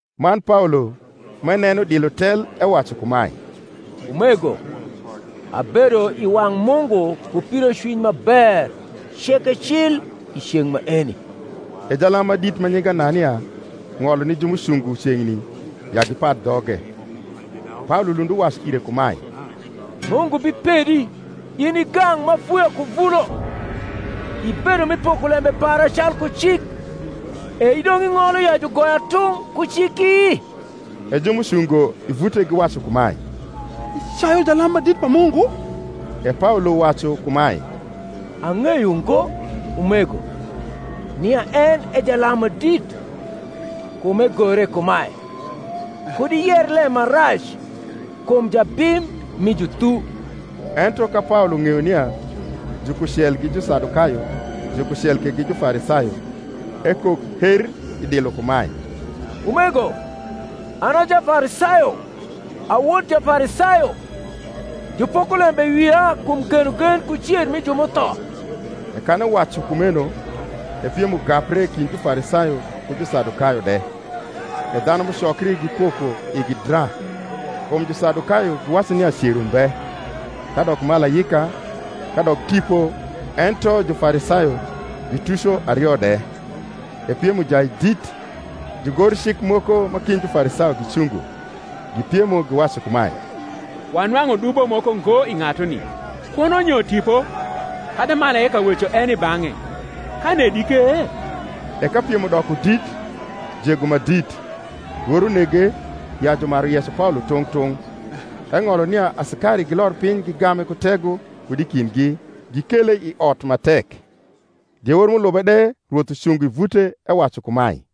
Man Paolo, m’eneno dilo tel, ewacu kumae, Umego, abedo i wang’ Mungu ku pidocwiny ma ber ceke cil i ceng’ maeni. E jalam ma dit ma nyinge Anania ng’olo ni ju m’ucungo ceng’ni ya gipad dhoge. Paolo lund uwacu ire kumae, Mungu bipedi, in i gang’ m’afuya ku vulo: ibedo mi poko lembe para calku cik, e idong’ ing’olo ya jugoya tung’ ku ciki? E ju m’ucungo i vute giwacu kumae, Icayu jalam ma dit pa Mungu? E Paolo wacu kumae, Ang’eyo ngo, umego, nia en e jalam ma dit: kum egore kumae, Kud iyer lem marac kum jabim mi juthu. Ento ka Paolo ng’eyo nia jukucel gi Jusadukayo jukucel ke gi Jufarisayo, ekok her i dilo kumae, Umego, an a Jafarisayo, a wod Jafarisayo: jupoko lembe i wia kum genogen ku cer mi ju m’utho. E kan ewacu kumeno, e piem ugapre kind Jufarisayo ku Jusadukayo de; e dhanu m’ucokri gipoko igi dra. Kum Jusadukayo giwacu nia cer umbe, kadok malaika, kadok tipo ento Jufarisayo gituco ario de. E piem ujai dit: jugorcik moko ma kind Jufarisayo gicungo, gipiemo, giwacu kumae, Wanwang’u dubo moko ngo i ng’atuni: kuno nyo tipo kadi malaika weco en i bang’e, ka nedi ke? E ka piem udoko dit, jego ma dit, lworo nege ya jumaru yeco Paolo tung’ tung’, eng’olo nia asikari gilor piny gigame ku tego kud i kindgi, gikele i ot ma tek. Diewor m’ulube de Rwoth ucungo i vute, ewacu kumae,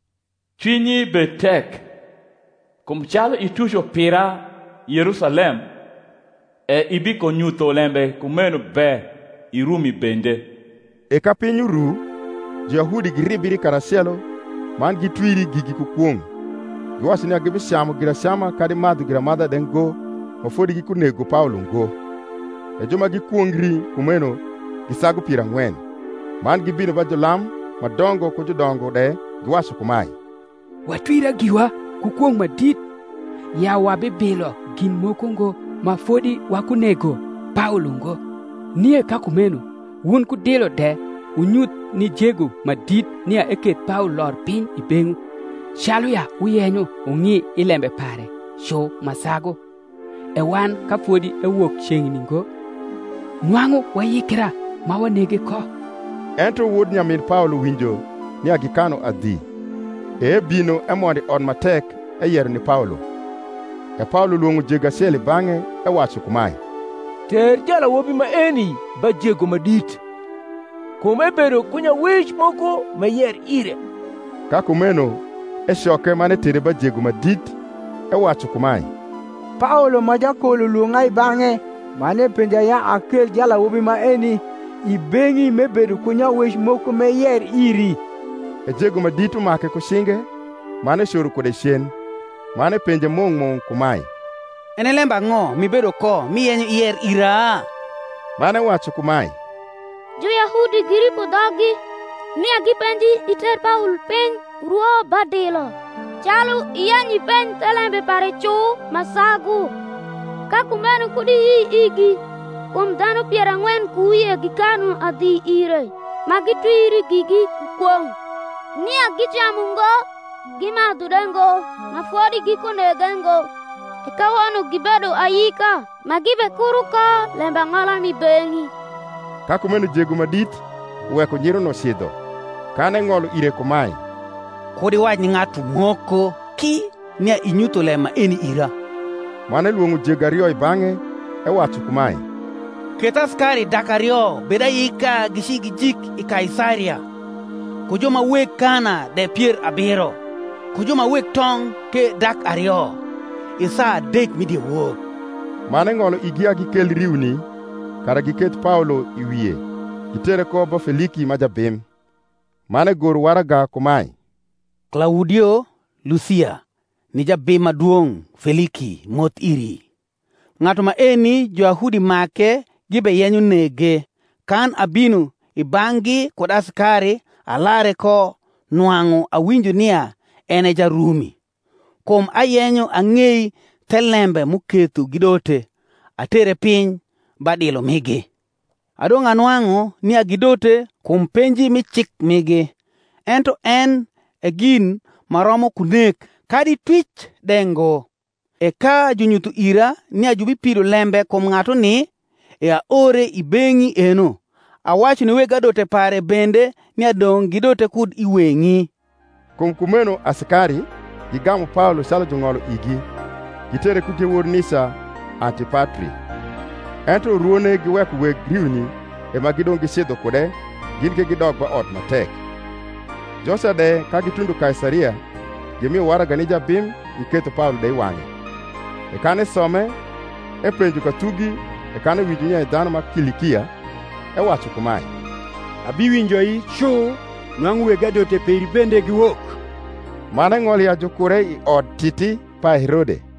Cwinyi bed tek: kum calu ituco pira Yerusalem, e ibikonyutho lembe kumeno be i Rumi bende. E ka piny uru, Juyahudi giribri karacelo, man gitwiri gigi ku kwong’, giwacu nia gibicamu giracama kadi madhu giramadha de ngo ma fodi gikunego Paolo ngo. E ju ma gikwongri kumeno gi sagu pier ang’wen. Man gibino ba julam ma dongo ku judongo de, giwacu kumae, Watwira giwa ku kwong’ ma dit, ya wabibilo gin moko ngo ma fodi wakunego Paolo ngo. Nie ka kumeno wun ku dilo de wunyuth ni jego ma dit nia eketh Paolo lor piny i beng’wu, calu ya wuyenyo wung’i i lembe pare cu ma sagu: e wan, ka fodi ewok ceng’ni ngo, nwang’u wayikra ma wanege ko. Ento wod nyamin Paolo winjo nia gikanu adhi, e ebino emondo i ot ma tek eyero ni Paolo. E Paolo lwong’o jego acel i bang’e, ewacu kumae, Ter jalawobi maeni ba jego ma dit; kum ebedo ku nyawec moko m’eyer ire. Ka kumeno ecoke, man etere ba jego ma dit, ewacu kumae, Paolo ma jakol ulwong’a i bang’e, man epenja ya akel jalawobi maeni i beng’i m’ebedo ku nyawec moko m’eyer iri. E jego ma dit umake ku cinge, man ecoro kude cen, man epenje mung’ mung’ kumae, En e lembang’o m’ibedo ko m’iyenyo iyer ira? Man ewacu kumae, Juyahudi giripo dhoggi, nia gipenji iter Paolo piny urwo ba dilo, calu iyenyo ipenj thelembe pare cu ma sagu. Ka kumeno kud iyi igi: kum dhanu pier ang’wen ku wie gikanu adhi ire, ma gitwiri gigi ku kwong’, nia gicamu ngo gimadhu de ngo ma fodi gikunege ngo: e kawono gibedo ayika, ma gibekuro ko lembang’ola m’i beng’i. Ka kumeno jego ma dit uweko nyiruno cidho, kan eng’olo ire kumae, Kud iwac ni ng’atu moko ki nia inyutho lem maeni ira. Man elwong’o jego ario i bang’e, ewacu kumae, Keth asikari dak ario bed ayika gici gijik i Kaisaria, ku ju ma weg kana de pier abiro, ku ju ma weg tong’ ke dak ario, i saa adek mi diewor: man eng’olo igi ya gikel riuni, kara giketh Paolo i wie, gitere ko bo ba Feliki ma jabim. Man egoro waraga kumae. Klaudio Lusia ni jabim ma dwong’ Feliki, moth iri. Ng’atu maeni Juyahudi make gibeyenyo nege, kan abino i bang’gi kud asikari alare ko nwang’u awinjo nia en e Jarumi. Kum ayenyo ang’ei thelembe m’uketho gidote, atere piny ba dilo migi: adong’ anwang’u nia gidote kum penji mi cik migi, ento en e gin ma romo ku nek kadi twic de ngo. E ka junyutho ira nia jubipido lembe kum ng’atuni, e aore i beng’i eno, awacu ni weg adote pare bende nia dong’ gidote kud i weng’i. Kum kumeno asikari, gigamu Paolo calu jung’olo rgi, gitere ku diewor nica Antipatri. Ento urwone giweko weg riuni e ma gidong’ gicidho kude, gin ke gidok ba ot ma tek: joca de, ka gitundo Kaisaria gimio waraga ni jabim, giketho Paolo de i wang’e. E kan esome, epenjo ka thugi; e kan ewinjo nia e dhanu ma Kilikia, ewacu kumae, Abiwinjoi cu nwang’u weg adote peri bende giwok: man eng’olo ya jukure i Odtiti pa Herode.